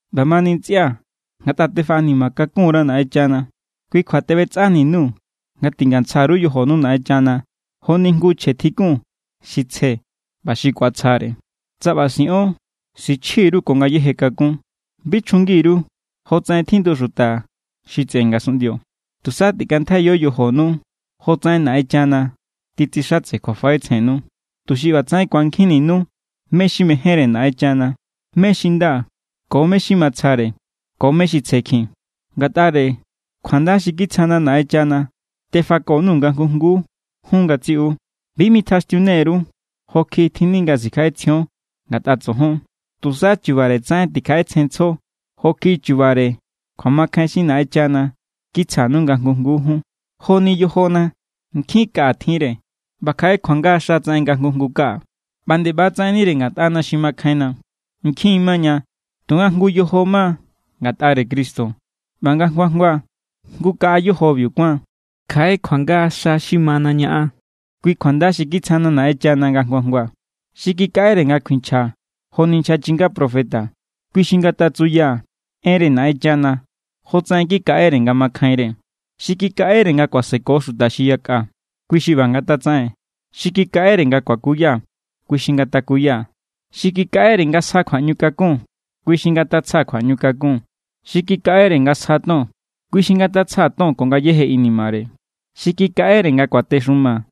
ꞌBamani ntsꞌia̱, ngatꞌa tifaꞌanima kakun_ra Naꞌenchana, kui kjua teꞌbetsꞌani_nuu̱ nga tingantsja_ru yojonu Naꞌenchana joni jngu chje tjikun xi tsje ꞌba xi ku̱atsjare. Tsa ꞌba siꞌon, sichji_ru ko ngayéje kakún. Bi chjungi_ru jotsaꞌen tjindu xuta xi tseꞌe ngasunꞌndio. Tusa tikꞌantjaiyo yojonu jotsaꞌen Naꞌenchana titsixatse kjuafaꞌetsjennu, tuxi ꞌbatsaꞌen ku̱ankjinninu mé= xi mejénre Naꞌenchana, mé= xi nda ko mé= xi matsjare ꞌba ko mé= xi tsjekjin. Ngatꞌare kjuanda xi kitsjana̱ Naꞌenchana tefako_nuu̱ nga jngu jnguu jun ngatsiꞌu. Bi mitjaxtiune_ru jo kjiꞌi tjinni nga sikjaꞌetsjion ngatꞌa tsojon. Tusa chubare tsaꞌen tikjaꞌetsjenntsjo jo kjiꞌi chubare kjuamakjain xi Naꞌenchana kitsjanu nga jngu jnguu jun. Joni yojona. Nkjin kaꞌa tjinre, ꞌba kjaꞌe kjuanga xa tsaꞌen nga jngu jngu kaꞌa. ꞌBa nde ꞌba= tsaꞌennire ngatꞌana xi makjainna. Nkjin maña. Tunga jngu= yojo ma ngatꞌare Cristo, ꞌba nga jngu jngua jngu= kaꞌa yojobiu kuáan. Kjaꞌe kjuanga xa xi mana ñaꞌan. Kui kjuanda xi kitsjana Naꞌenchana nga jngua jngua. Xi kikaꞌere nga kuinchja joni nchja chinga profeta, kui xi ngatsuya enre Naꞌenchana jotsaꞌen kikaꞌere nga makjainre. Xi kikaꞌere nga kuaseko xuta xi yakꞌa, kui xi ꞌba ngatatsaꞌen. Xi kikaꞌere nga kuakuya, kui xi ngatakuya. Xi kikaꞌere nga sja kjuaꞌñukakun, kui xi ngatatsja kjuaꞌñukakun. Xi kikaꞌere nga sja ton, kui xi ngatatsja ton ko ngayéje inimare. Xi kikaꞌere nga kuatexuma,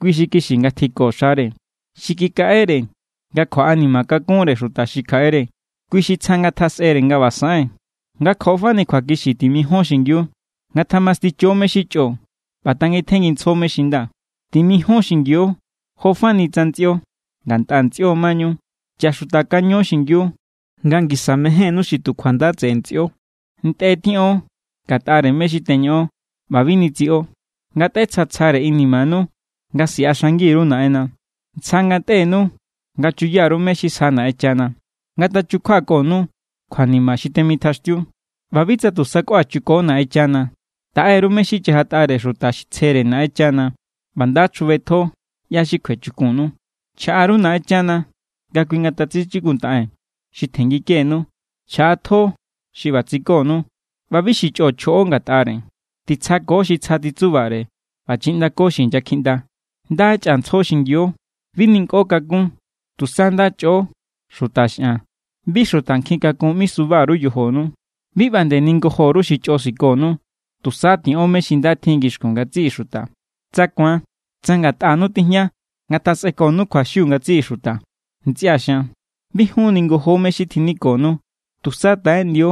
kui xi kixi ngatjiko xare. Xi kikaꞌere nga kjuaꞌanima kakunre xuta xi kjaꞌere, kui xi tsja ngatjasꞌere nga ꞌba saꞌen. Nga ko fani kjuakixi timijion xingiu. Ngatjamasticho mé= xi chꞌo ꞌba tangitjenngintsjo mé= xi nda. Timijion xingiu jo fani tsa ntsꞌio, ngatꞌa ntsꞌio mañu. Chaxutakaño xingiu nga ngisa mejénnú xi tu kjuanda tseꞌe ntsꞌio. Ntꞌe tiꞌon ngatꞌare mé= xi teñoꞌon ꞌba bi nitsiꞌo. Ngatꞌetsjatsjare inimanu nga siꞌaxangi_ru Naꞌenna. Tsja ngatꞌenu nga chuya_ru mé= xi sjanu Naꞌenchana. Ngatachukjuakonu kjuanima xi temitjaꞌaxtiu. ꞌBa bi tu sakꞌua chuko Naꞌenchana. Taꞌe_ru mé= xi chajatꞌare xuta tsjere Naꞌenchana ꞌba nda chjubetjo ꞌyá= xi kjuechukunnu. Chjaꞌa_ru Naꞌenchana nga kui ngatatsichikuntaꞌen xi tjenngikenu. Chjaꞌatjo xi ꞌba tsikonu ꞌba bi xi chꞌo chjoꞌo ngatꞌare. Titsjako xi tsja titsubare ꞌba chiꞌndako xi inyakjiꞌnda. Nda chꞌantsjo xingiu. Bi ninkꞌo kakún. Tusa nda chꞌo xuta xꞌan. Bi xuta nkjin kakun ꞌmisuba_ru yojonu. Bi ꞌba nde ningojo_ru xi chꞌo sikonu. Tusa tiꞌon mé= xi nda tjin ngixkun ngatsiꞌi xuta. Tsa ku̱an, tsa ngatꞌanu tijña, ngatjasꞌekonu kjuaxiu ngatsiꞌi xuta. Ntsꞌia̱ xian, bi jun ningojo mé= xi tjinikonu. Tusa taꞌeꞌndio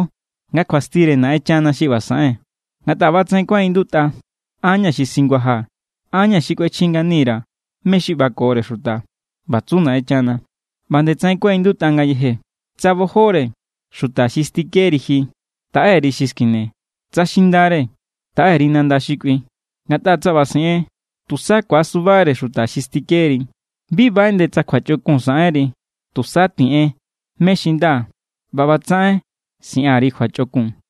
nga kjuastire Naꞌenchana xi ꞌba saꞌen. Ngatꞌa ꞌbatsaꞌen kuaꞌindutꞌa: “An= ña̱ xi singuajaa̱. An= ña̱ xi kꞌuechji ngani_ra̱ mé= xi ꞌbakore xuta.” ꞌBa tsu Naꞌenchana. ꞌBa ꞌba nde tsaꞌen kuaꞌindutꞌa ngayeje: “Tsa bojore xuta xi stikeri ji, taꞌe_ri xi skine. Tsa xindare, taꞌe_ri nanda xi kꞌui. Ngatꞌa tsa ꞌba siꞌen, tusa ku̱asubare xuta xi stikeri.” Bi baꞌeꞌnde tsa kjuachꞌokun saꞌenri. Tusa tiꞌen mé= xi nda ꞌba ꞌbatsaꞌen siꞌan_ri kjuachꞌokun.